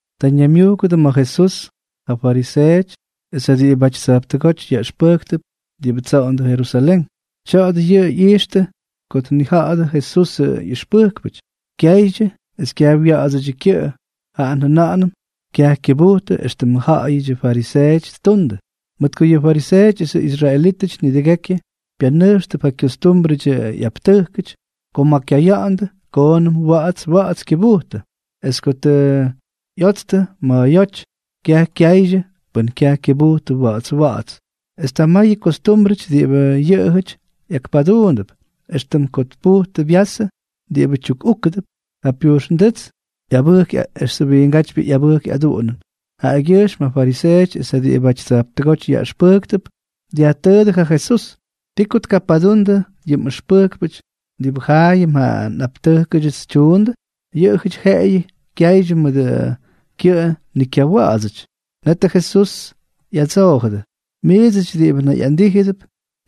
Ta ñaymyujkʉdʉ ma̱ Jesús ja fariseeʉty es ja diꞌibʉty tsa̱jptʉgóty yaꞌʉxpʉjktʉp diꞌibʉ tsoꞌondʉ Jerusalén. Tya̱a̱dʉ yʉꞌʉ ꞌyijxtʉ ko nijaꞌadyʉ Jesusʉ ꞌyʉxpʉjkpʉty kyaydyʉ es kyaj wya̱ꞌa̱dsʉdyʉ kyʉꞌʉ, jaꞌa njʉna̱ꞌa̱nʉm kyaj kyʉbujtʉ éxtʉm jaayʉm fariseeʉty ttundʉ. Mʉt ko yʉ fariseeʉty esʉ israelítʉty nidʉgekyʉ pyanʉjxtʉp ja kyostúmbrʉdyʉ ꞌyaptʉjkʉty ko ma̱ kyaya̱ꞌa̱ndʉ koonʉm wa̱ꞌa̱ts wa̱ꞌa̱ts kyʉbujtʉ. Es ko tʉ ꞌyotstʉ ma̱a̱yóty, kyaj kyaydyʉ pʉn kyaj kyʉbujtʉ wa̱ꞌa̱ts wa̱ꞌa̱ts. Es ta mayʉ kostúmbrʉty diꞌibʉ yʉꞌʉjʉty ꞌyakpaduundʉp, éxtʉm ko tpujtʉ vyasʉ diꞌibʉ tyukꞌúkʉdʉp, ja pyujxnduꞌts esʉ wiingátypyʉ ꞌyabʉjk ꞌyaduꞌunʉn. Jaꞌagyʉjxm ja fariseeʉty es ja diꞌibʉty tsa̱jptʉgóty yaꞌʉxpʉjktʉp dyajtʉʉdʉ ja Jesús: —¿Ti ko tkapadundʉ yʉ mꞌʉxpʉjkpʉty diꞌibʉ jaayʉm ja nꞌaptʉjkʉdyʉts ttundʉ? Yʉꞌʉjʉty jeꞌeyʉ kyaydyʉ mʉdʉ kyʉꞌʉ ni kyawa̱ꞌa̱dsʉty. Netʉ Jesús ꞌyadsoojʉdʉ: —Miidsʉty diꞌibʉ nayꞌandíjʉdʉp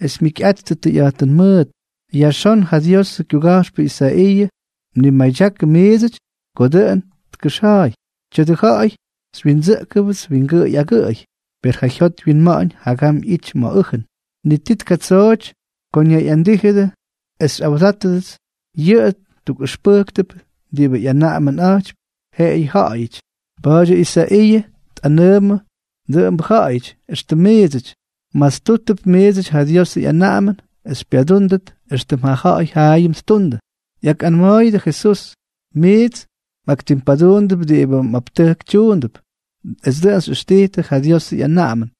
es jyikyꞌattʉ tʉyꞌa̱jtʉn mʉʉt, yajxón ja Diosʉ kyuga̱jxpʉ Isaiiʉ mnimadyakʉ miidsʉty ko dʉꞌʉn tkʉxja̱a̱y: Tya̱dʉ ja̱ꞌa̱y xywyindsʉꞌkʉpts wingʉꞌʉy agʉꞌʉy, per ja jyot wyinma̱ꞌa̱ñ jagam ꞌyity ma̱ ʉjʉn. Ni ti tkatsooty ko ñayꞌandíjʉdʉ es xyjaꞌꞌawdáttʉts. Yʉꞌʉ tukꞌʉxpʉjktʉp diꞌibʉ ꞌyanaꞌamʉnꞌa̱jtypy jeꞌeyʉ ja̱ꞌa̱yʉty. Pa̱a̱dyʉ Isaiiʉ tꞌanʉʉmʉ dʉꞌʉmbʉ ja̱ꞌa̱yʉty éxtʉm miidsʉty. Mmastúttʉp miidsʉty ja Diosʉ ꞌyanaꞌamʉn es xypyadúndʉt éxtʉm ja ja̱ꞌa̱y jaayʉm ttundʉ. ꞌYakꞌanma̱a̱yʉdʉ ja Jesús: —Miits mꞌaktimpaduundʉp diꞌibʉ mꞌaptʉjk tyuundʉp, es dʉꞌʉn xyꞌʉxtijtʉ ja Diosʉ ꞌyanaꞌamʉn.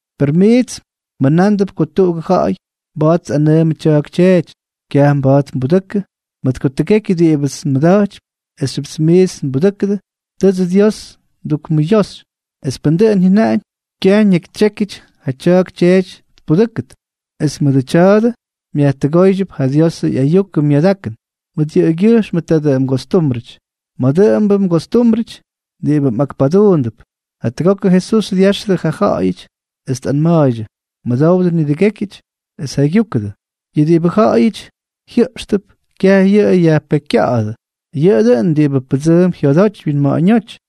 Per miits mjʉnándʉp ko tuꞌugʉ ja̱ꞌa̱y mba̱a̱t tꞌanʉʉmʉ tya̱a̱k tyeety: “Kyaj mba̱a̱t nbudʉkʉ, mʉt ko tʉgekyʉ diꞌibʉts nmʉda̱jtypy esxyʉp miits nbudʉ́kʉdʉ, tʉʉdsʉ Dios ndukmʉyoxy.” Es pʉn dʉꞌʉn jyʉnaꞌañ, kyaj ñakytsyékyʉty ja tya̱a̱k tyeety tpudʉ́kʉt. Es mʉdʉ tya̱a̱dʉ myajtʉgooydyʉp ja Diosʉ ꞌyayukʉ myadakʉn mʉt yʉꞌʉgyʉjxmʉ tadʉ mgostúmbrʉty. Mayʉ dʉꞌʉmbʉ mgostúmbrʉty diꞌibʉ mꞌakpaduundʉp. Jatʉgokʉ Jesús dyáxʉdʉ ja ja̱ꞌa̱yʉty, es tꞌanma̱a̱ydyʉ: —Mʉdowdʉ nidʉgékyʉty, es jaygyúkʉdʉ. Yʉ diꞌibʉ ja̱ꞌa̱yʉty jyʉꞌxtʉp, kyaj yʉꞌʉ yajpekykya̱ꞌa̱dʉ, yʉꞌʉ dʉꞌʉn diꞌibʉ pʉdsʉʉmp jyodoty wyinma̱ꞌa̱ñóty.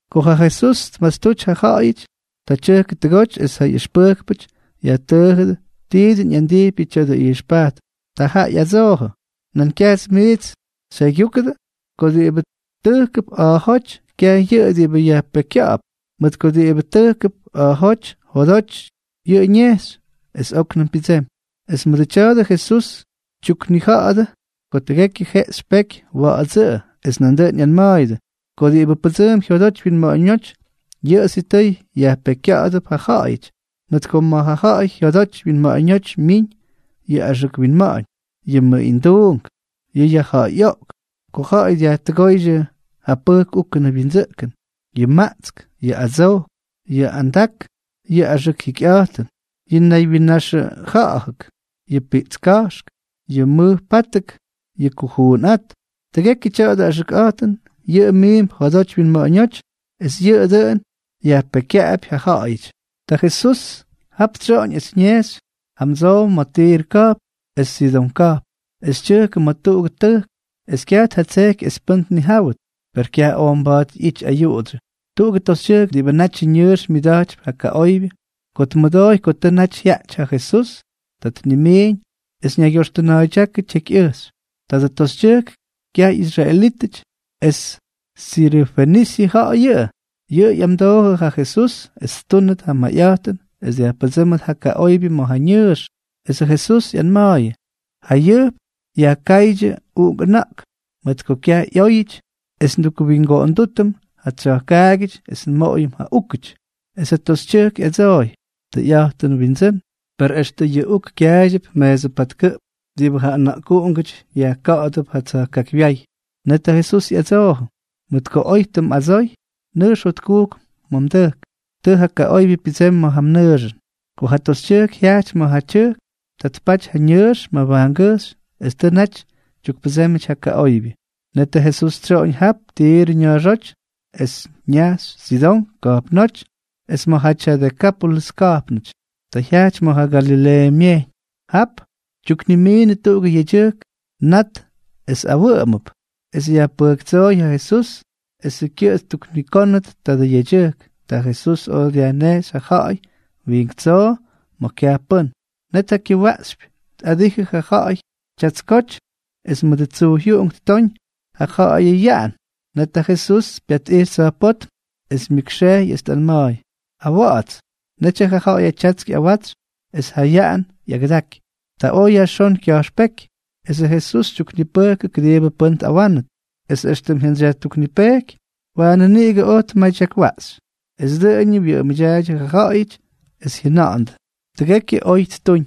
Ko ja Jesús tmastuty ja ja̱ꞌa̱yʉty, ta tyʉjkʉ tʉgoty es ja ꞌyʉxpʉjkpʉty yajtʉʉjʉdʉ ti dʉn ꞌyandijpyʉ tya̱dʉ ꞌyijxpajtʉn. Ta jaꞌa ꞌyadsoojʉ: —¿Nan kyaj miits xyjaygyúkʉdʉ? Ko diꞌibʉ tʉjkʉp a̱a̱jóty, kyaj yʉꞌʉ diꞌibʉ yajpekykya̱ꞌa̱p, mʉt ko diꞌibʉ tʉjkʉp a̱a̱jóty, jodoty yʉꞌʉ ñejxy, es óknʉm pyʉdsemy. Es mʉdʉ tya̱a̱dʉ Jesús tyuknija̱ꞌa̱dʉ ko tʉgekyʉ jeꞌxy peky, wa̱ꞌa̱dsʉꞌʉ. Es nandʉꞌʉn ꞌyanma̱a̱yʉdʉ: —Ko diꞌibʉ pʉdsʉʉmp jyodoty wyinma̱ꞌa̱ñóty, yʉꞌʉ sitʉy yajpekykya̱ꞌa̱dʉp ja ja̱ꞌa̱yʉty, mʉt ko ma̱ ja ja̱ꞌa̱y jyodoty wyinma̱ꞌa̱ñóty myiñ yʉ axʉk winma̱ꞌa̱ñ, yʉ mʉꞌinduunk, yʉ yajja̱ꞌa̱yꞌoꞌk, ko ja̱ꞌa̱y dyajtʉgóydyʉ yʉ pʉjk úkʉnʉ wyindsʉꞌkʉn, yʉ maꞌtsk, yʉ adsojk, yʉ andak, yʉ axʉk jikyꞌa̱jtʉn, yʉ naywyinnaxʉja̱ꞌa̱k, yʉ piꞌtska̱jx, yʉ mʉjpátʉk, yʉ kujuunꞌát. Tʉgekyʉ tya̱dʉ axʉkꞌa̱jtʉn, yʉꞌʉ miimp jodoty winma̱ꞌa̱ñóty, es yʉꞌʉ dʉꞌʉn yajpekykyaꞌapy ja ja̱ꞌa̱yʉty. Ta Jesús jap tsyoꞌoñ es ñejxy jamdsow ma̱ Tirʉ ka̱jpn es Sidón ka̱jpn. Es tyʉjkʉ ma̱ tuꞌugʉ tʉjk, es kyaj tjatsejky es pʉ́n tnijáwʉt. Per kyaj oj mba̱a̱t ꞌyity ayuꞌudsyʉ. Tuꞌugʉ toxytyʉjk diꞌibʉ natyʉ ñʉʉx myʉda̱jtypy ja kaꞌoybyʉ, ko tmʉdooy ko tʉ naty jyaꞌty ja Jesús, ta tnimiiñ es ñaygyoxtʉna̱a̱ydyákʉ tyekyꞌʉjxy. Tadʉ toxytyʉjk kyaj ꞌyisraelítʉty es sirʉfenisyʉ ja̱ꞌa̱y. Yʉꞌʉ ꞌyamdoojʉ ja Jesús es ttúnʉt ja mayꞌa̱jtʉn es dyajpʉdsʉ́mʉt ja kaꞌoybyʉ ma̱ ja ñʉʉx. Esʉ Jesús ꞌyanma̱a̱yʉ: —Jayʉjp yajkáydyʉ uꞌunk ʉna̱ꞌk, mʉt ko kyaj ꞌyóyʉty es ndukwingoꞌondútʉm ja tsya̱jkaagyʉty es nmoꞌoyʉm ja úkʉty. Es ja toxytyʉjk ꞌyadsooy: —Tʉyꞌa̱jtʉnʉꞌʉ, Windsʉ́n, per extʉ yʉ uk kyaaydyʉp meesʉ patkʉꞌp diꞌibʉ ja ʉna̱ꞌkuꞌungʉty yajka̱ꞌa̱dʉp ja tsya̱jkaakywyáy. Net ja Jesús ꞌyadsoojʉ: —Mʉt ko oy tʉ mꞌadsoy, nʉjx jotkujk ma̱ mdʉjk. Tʉ ja kaꞌoybyʉ pyʉdsemy ma̱ ja mnʉʉxʉn. Ko ja toxytyʉjk jyajty ma̱ ja tyʉjk, ta tpaty ja ñʉʉx mabajngʉjxy es tʉ naty tyukpʉdsémyʉty ja kaꞌoybyʉ. Netʉ Jesús tsyoꞌoñ jap Tirʉ ña̱a̱xóty, es ñajxy Sidón ka̱jpnóty es ma̱jaty ja Dekápolʉs ka̱jpnʉty. Ta jyajty ma̱ ja Galileeʉ Myejyñ. Jap tyuknimiinʉdʉ tuꞌugʉ yedyʉjk nat es awʉꞌʉmʉp, es yajpʉjktsooy ja Jesús esʉ kyʉꞌʉ ttuknikónʉt tadʉ yedyʉjk. Ta Jesús oj dyajnejxy ja ja̱ꞌa̱y wiink tsoo ma̱ kyaj pʉ́n. Net ja kyʉwaꞌxypy tꞌadijʉ ja ja̱ꞌa̱y tyatskoty es mʉdʉ tsyujy ttooñ ja ja̱ꞌa̱yʉ yaꞌan. Net ja Jesús pyatꞌijxy tsa̱jpótm, es myʉkxejy es tꞌanma̱a̱y: —¡Awa̱ꞌa̱ts! Netyʉ ja ja̱ꞌa̱yʉ tyatsk ꞌyawatsy es ja yaꞌan ꞌyagʉdaky. Ta oj yajxón kya̱jxpéky. Esʉ Jesús tyuknipʉjkʉ kʉdiibʉ pʉ́n tꞌawánʉt. Es éxtʉm jyantsyjyayajtuknipejky, waanʉ niꞌigʉ oj tmadyakwaꞌxy. Es dʉꞌʉñʉ wyʉꞌʉmʉdyaaydyʉ ja ja̱ꞌa̱yʉty, es jyʉna̱ꞌa̱ndʉ: —Tʉgekyʉ oy ttuñ,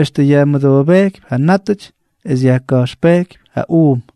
extʉ yajmʉdoobejkypy ja nátʉty es yajka̱jxpejkypy ja uum.